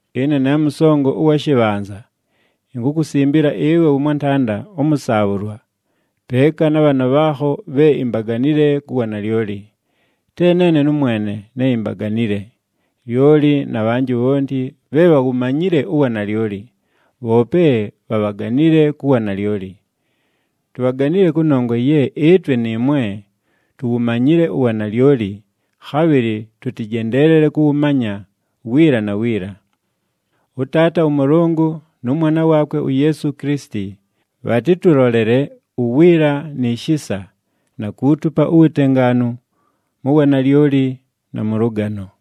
Ɨne ne mʉsongo ʉwa shɨbhanza, inkukusimbila ɨwe wʉmwantanda ʉmʉsaabhʉlwa, peeka na bhaana bhaakho bhe imbaganile ku wanalyoli. Te neene nʉmwene ne imbaganile, lyoli na bhanjɨ bhonti bhe bhawumanyile uwanalyoli, bhoope bhabhaganile ku wanalyoli. Tubhaganile kʉnongwa ye ɨtwe nɨɨmwe tuwumanyile uwanalyoli, khabhɨlɨ tʉtɨjendeelele kʉwʉmanya wiila na wiila. ɄTaata ʉMʉlʉngʉ nʉ Mwana waakwe uYeesu Kilisiti, bhatɨtʉlolele uwiila ni shisa, na kuutupa uwutengaanu, mu wanalyoli, na mʉ lʉgano.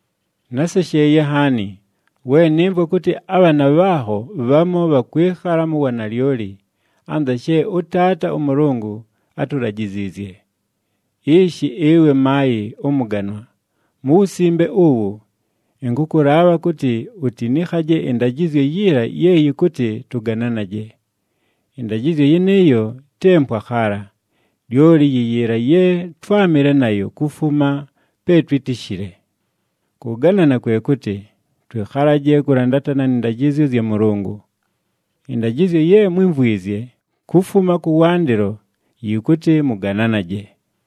Násesheeye nhaani, we nɨmvwa kʉtɨ abhaana bhaakho bhamu bhakwɨkhala mu wanalyoli, anza she ʉTaata ʉMʉlʉngʉ átulajiziizye. Ishi, ɨwe maayɨ ʉmʉganwa, mu wusimbe uwu, ɨnkʉkʉlaabha kʉtɨ utinikhaje ɨndajɨzyo yiila ye yɨkʉtɨ tʉgananaje. Ɨndajɨzyo yɨnɨɨyo, te mpwa khaala, lyoli yi yiila ye twámɨle nayo kufuma pe twítishile. Kʉganana kwe kʉtɨ, twɨkhalaje kʉlandatana nɨ ndajɨzyo zya Mʉlʉngʉ. Ɨndajɨzyo ye mwímvwizye kufuma kʉwandɨlo yɨkʉtɨ mʉgananaje.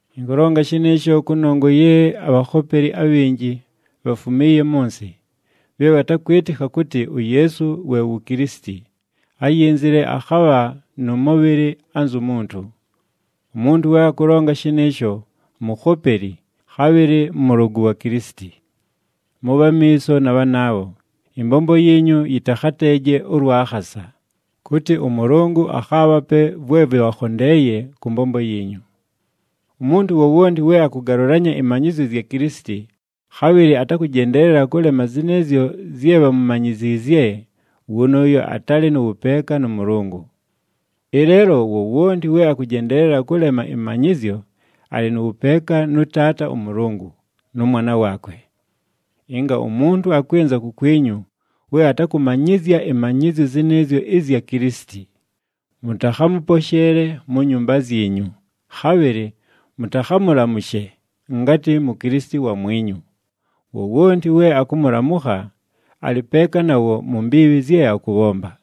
Ɨnkʉlonga shɨnɨɨsho kʉnongwa ye abhakhopeli abhinji bhafumiiye mʉ nsɨ, bhe bhatakwɨtɨkha kʉtɨ uYeesu we wu Kilisiti, áyinzile akhabha nʉ mʉbhɨlɨ anzu muntu. Umuntu we akʉlonga shɨnɨɨsho, mukhopeli, khabhɨlɨ mʉlʉgʉ wa Kilisiti. Mʉbhe amiiso na bhanaabho, ɨmbombo yiinyu yɨtakhateeje ʉlwa khasa, kʉtɨ ʉMʉlʉngʉ akhaabhape vwe vɨbhakhondeeye kʉ mbombo yiinyu. Umuntu wowonti we akʉgalʉlanya ɨmanyɨzyo zya Kilisiti, khabhɨlɨ atakʉjendeelela kʉlema zɨnɨɨzyo zye bhamumanyiziizye, wʉnʉʉyo atalɨ nʉ wʉpeeka nʉ Mʉlʉngʉ. Ɨleelo, wowonti we akʉjendeelela kʉlema ɨmanyɨzyo, alɨ nʉ wʉpeeka nʉ Taata ʉMʉlʉngʉ, nʉ Mwana waakwe. Ɨnga umuntu akwɨnza kukwinyu we atakʉmanyɨzya ɨmanyɨzyo zɨnɨɨzyo ɨzya Kilisiti, mʉtakhamʉposheele mu nyumba zyinyu, khabhɨlɨ mʉtakhamʉlamʉshe ngatɨ Mukilisiti wamwinyu. Wowonti we akʉmʉlamʉkha, alɨ peeka nawo mu mbiibhi zye akʉbhomba.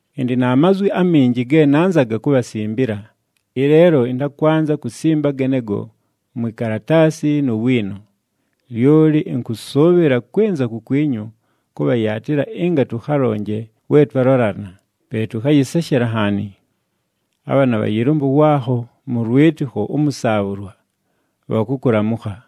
Ɨndɨ na mazwi aminji ge nanzaga kubhasimbila, ɨleelo ɨntakwanza kusimba genego mwi kalataasi nu wiino. Lyoli ɨnkʉsʉʉbhɨla kwɨnza kukwinyu kʉbhayaatɨla ɨnga tʉkhalonje we twalolana, pe tʉkhayɨseshela nhaani. Abhaana bha yɨlʉmbʉ waakho mʉ lwɨtɨkho ʉmʉsaabhʉlwa, bhakʉkʉlamʉkha.